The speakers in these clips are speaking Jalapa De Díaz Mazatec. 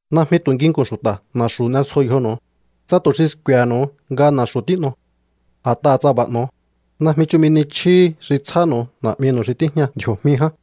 ’Najmi tu̱ nginku̱n xu̱ta̱ na̱xu̱ n'esjo yjonu̱u, tsa tu̱ xi sku̱e̱he̱nu̱u nga na̱xu̱ tín'o. A̱t'aha̱ tsa b'a̱ n'o̱o, najmi chumi ni chjíhi xi tsjánu̱u Na̱'minu̱u xi tíjña ndji̱o̱jmi ján.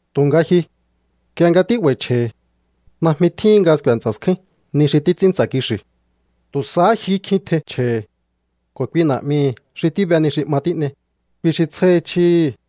Tu̱nga ji, nk'ie nga tí'ba̱i̱ chje̱hi̱, najmi tjíhin nga sku̱e̱ ntsa̱ skjúín ni xi títs'ín ntsa̱ kixi̱. Tu̱ sahá jyuhú kj'i tjein chje̱hi̱. Ko̱ kui Na̱'mihi̱ xi tíbe ni xi 'ma tín'ei, kui xi tsjáhi chjíhi̱.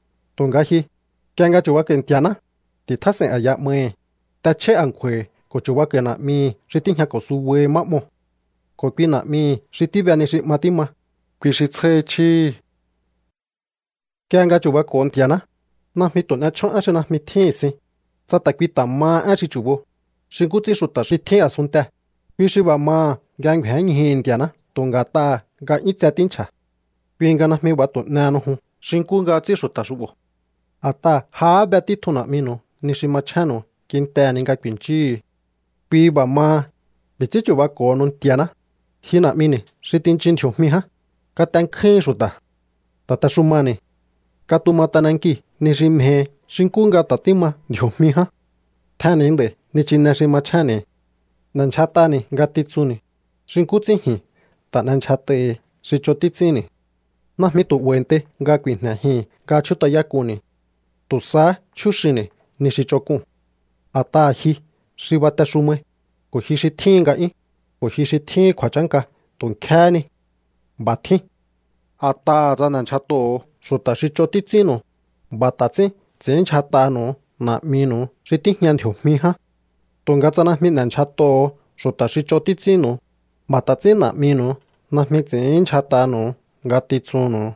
Tu̱nga ji, nk'ie nga chu̱bako̱i̱ Nti̱a̱ná, ti̱tjás'e̱i̱n a̱ya 'mahi̱, t'echjáí a̱nkju̱a̱hi̱ ko̱ chu̱bako̱i̱ Na̱'mihi̱ xi tíjñako̱ subahi má 'moo̱. Ko̱ kui Na̱'mihi̱ xi tíbe ni xi 'ma tíma, kui xi tsjáhi chíhi̱. ’Nk'ie nga chu̱bako̱o Nti̱a̱ná, najmi tu̱ n'e chjón én xi najmi tjíhi̱n sin, tsa ta̱ kui ta̱ maha én xi chu̱bo, xi nkú ts'ín xu̱ta̱ xi tjín a̱sunntee̱. Kui xi b'a̱ maha̱ nga ngju̱énñjuhu̱ Nti̱a̱ná tu̱ nga̱t'aha̱ nga 'yún tse tínchja̱. Kui nga najmi b'a̱ tu̱ n'ehenu jun xi nkú nga ts'ín xu̱ta̱ xu'bo̱. A̱t'aha̱ jahá be títjun Na̱'minu̱u ni xi machjénnu̱u kintehe̱ ni nga ku̱i̱nchíhu̱u. ’Kui b'a̱ maha, b'i̱ ts'ín chu̱bako̱honu Nti̱a̱ná: Ji Na̱'mini̱ xi tinchin ndji̱o̱jmi ján, katenkjúhin xu̱ta̱. Ta̱texumani̱. Katuma t'anankii̱ ni xi mjehi xi nkú nga ta̱ tíma ndji̱o̱jmi ján. Tjenni̱ nd'a̱i̱ nichine xi machjénni̱. N'e̱ndyjat'ani̱ ngatitsunni̱, xi nkú ts'ín ji̱n ta̱ n'endyjat'ai̱hi̱ xi ch'on títs'ínni̱. Najmi tu̱ 'ba̱i̱ntei nga ku̱i̱jne̱jii̱n nga chjút'ayák'unni̱. Tu̱ sahá chjúxinni̱ ni xi ch'onk'uu̱n. A̱t'aha̱ ji xi batexumai, ko̱ ji xi tjíhin nga'yún, ko̱ ji xi tjíhin kju̱a̱chánka tu̱ nkj'íéhé ni. B'a̱ tjín. ’A̱t'aha̱ tsa n'e̱ndyjat'oho̱o xu̱ta̱ xi ch'on títs'ínnu̱u, b'a̱ ta̱ ts'ín ts'i̱ínndyjat'anu̱u Na̱'minu̱u xi tíjña ndji̱o̱jmi ján. Tu̱nga tsa najmi n'e̱ndyjat'oho̱o xu̱ta̱ xi ch'on títs'ínnu̱u, b'a̱ ta̱ ts'ín Na̱'minu̱u najmi ts'i̱ínndyjat'anu̱u ngatitsunnu̱u.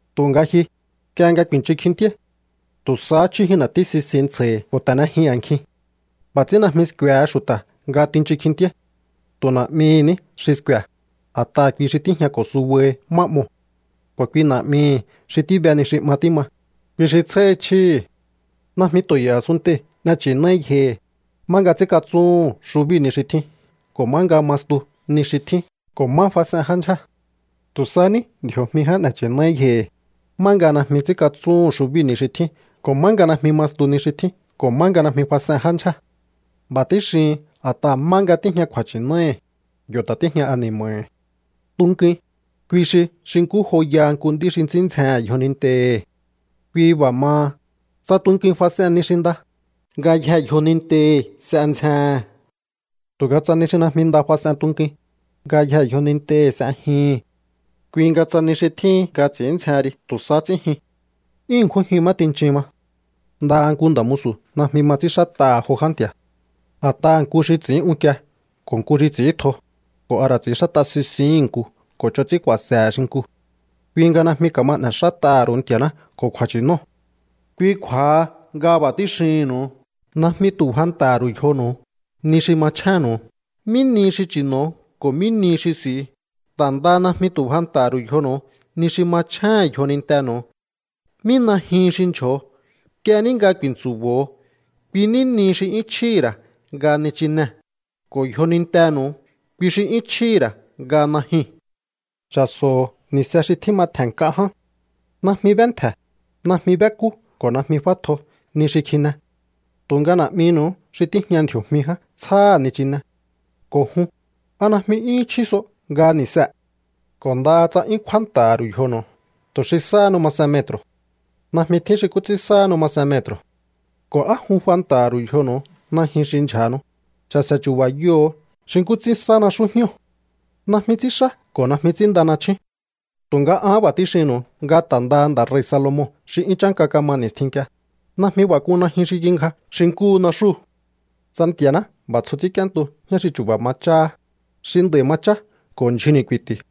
Tu̱nga ji, nk'ie nga ku̱i̱nchun kjintíáí, tu̱ sahá chjújin na̱tí sisin ntsja̱hi̱ ko̱ ta̱nejin a̱nkjin. B'a̱ ts'ín najmi sku̱e̱he xu̱ta̱ nga tinchun kjintíáí. Tu̱ Na̱'mihi̱ ní xi sku̱e̱, a̱t'aha̱ kui xi tíjñako̱ subahi má 'moo̱. Ko̱ kui Na̱'mihi̱ xi tíbe ni xi 'ma tíma, kui xi tsjáhi chjíhi̱. ’Najmi tu̱ e̱i̱ a̱sunntei̱ n'e nchi̱náí yjohi̱, má nga ts'ínkatsúhu̱n xubíu̱ ni xi tjín ko̱ má nga ma stu ni xi tjín ko̱ má fas'en já ndyjée̱. Tu̱ sa ní ndji̱o̱jmi ján n'e̱ nchi̱náí yjohi̱, má nga najmi ts'ínkatsúhu̱n xubíu̱ ni xi tjín ko̱ má nga najmi ma stu ni xi tjín ko̱ má najmi fas'en já ndyjé. B'a̱ tíxihin a̱t'aha̱ má nga tíjña kju̱a̱nchi̱náhi̱, yo̱ ta̱ tíjña ani̱ma̱hi̱. ’Tunkuin, kui xi xi nkú joyaha nku nd'í xi ts'ín ndzjehe̱n yjonintehi̱. Kui b'a̱ maha, tsa tunkuin fas'en ni xi nda, ngayjee̱ yjonintehi̱ s'e ndzjehe̱n. Tu̱nga tsa ni xi najmi nda fas'en tunkuin, ngayjee̱ yjonintehi̱ s'e jyuhu̱n. Kui nga tsa ni xi tjíhin nga ts'i̱ín ndzjehen ri tu̱ sahá ts'ín jyun, ¡'yún ṉkjún jyun má tinchin ma! ’Ndaha nku nda̱ musu̱ najmi ma ts'ínxát'aha̱ jo já nti̱a̱. A̱t'aha̱ nku xi ts'i̱ín unkie ko̱ nku xi ts'i̱íntjo, ko̱ a ra̱ ts'i̱ínxát'a sisihi̱n nku ko̱ ch'on ts'ín ku̱a̱se̱he̱ xinkuu̱. Kui nga najmi ka̱ma n'e̱xát'aha̱ ru̱u Nti̱a̱ná ko̱ kju̱a̱nchi̱nóo̱. ’Kui kju̱a̱ha nga b'a̱ tíxihi̱nnu̱u. Najmi tu̱ fanta̱ha̱ ru̱u yjonu̱u ni xi machjénnu̱u, mí nihi xi chi̱no̱o ko̱ mí nihi xi s'i̱u. Ta̱ ndaha najmi tu̱ fanta̱ha̱ ru̱u yjonu̱u ni xi machjéhe̱n yjonintenu̱u, mí najyuhun xi ndyjo̱o. Nk'ie ní nga ku̱i̱ntsu̱bo̱o, kui ní nihi xi 'yún chjíhi̱ ra̱ nga nichinee̱. Ko̱ yjonintenu̱u, kui xi 'yún chjíhi̱ ra̱ nga najyuu̱n. Cha̱so̱ho̱ ni̱se xi tjíma tje̱n nk'a ján. Najmi b'éntje̱, najmi b'ékú ko̱ najmi f'átjo ni xi kji̱ne̱. Tu̱nga Na̱'minu̱u xi tíjña ndji̱o̱jmi ján tsjáha̱ nichine. Ko̱ jun, ¿a najmi 'yúhún chjí so nga ni̱see̱? Ko̱ ndaha tsa 'yún kjúánta̱ha̱ ru̱u yjonu̱u tu̱ xi sáhanu masen metru̱, najmi tjín xi nkú ts'ín sáhanu masen metru̱. ’¿Ko̱ á jun fanta̱ha̱ ru̱u yjonu̱u najyun xi ndyja̱hanu? Cha̱se̱ chu̱ba̱yoho̱o xi nkú ts'ín sá naxú jñóo̱. Najmi ts'ínxá ko̱ najmi ts'ínnda nachjún. Tu̱nga an b'a̱ tíxinnu̱u nga ta̱ ndaha nda̱ rei̱ Salomon xi 'yún chánka kama ni̱stjin nk'ie, najmi b'a̱ k'un najyun xi kingja xi nkúhu naxúu̱. Tsa Nti̱a̱ná b'a̱ tsjo ts'ínk'íéntu jñá xi chu̱ba̱ ma cháhá, xi nd'a̱i̱ ma chá ko̱ ndyjunni̱ ku̱i̱ti̱,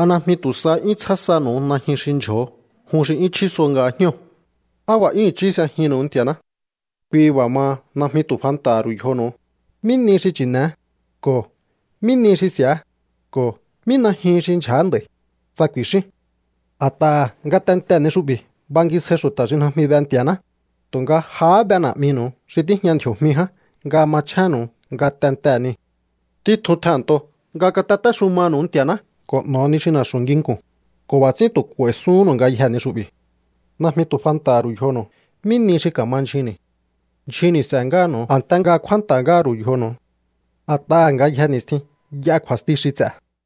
¿a najmi tu̱ sahá 'yún tsjá sanu̱u najyun xi ndyjo̱o jun xi 'yún chjí so nga jñóo̱? ¡Á b'a̱ 'yún i̱chí s'ejihi̱nnu̱u Nti̱a̱ná! ’Kui b'a̱ maha, najmi tu̱ fanta̱ha̱ ru̱u yjonu̱u: “¿Mí nihi xi chi̱ne̱é?” ko̱ “¿Mí nihi xi s'i̱á?” ko̱ “¿Mí najyuhun xi ndyja̱á nd'a̱i̱?”, tsa ku̱i̱xíún. A̱t'aha̱ ngatentee̱ ni xu'bi̱ bangisjai xu̱ta̱ xi najmi be Nti̱a̱ná, tu̱nga jahá be Na̱'minu̱u xi tíjña ndji̱o̱jmi ján nga machjénnu̱u ngatentee̱ niu̱. Títjun tjehe̱nnto nga katatéxumanu̱u Nti̱a̱ná ko̱ n'o̱o ni xi na̱xu̱ nginku̱n, ko̱ b'a̱ ts'ín tu̱ k'u̱a̱i̱suhúnnu̱u ngayjee̱ ni xu'bi̱. Najmi tu̱ fanta̱ha̱ ru̱u yjonu̱u mí nihi xi ka̱ma ndyjunni̱. Ndyjunni̱ s'e̱ ngáha̱nu̱u a̱nte nga kjúánta̱ ngáha̱ ru̱u yjonu̱u. A̱t'aha̱ ngayje ni̱stjin y'a kju̱a̱sti xi ts'e̱.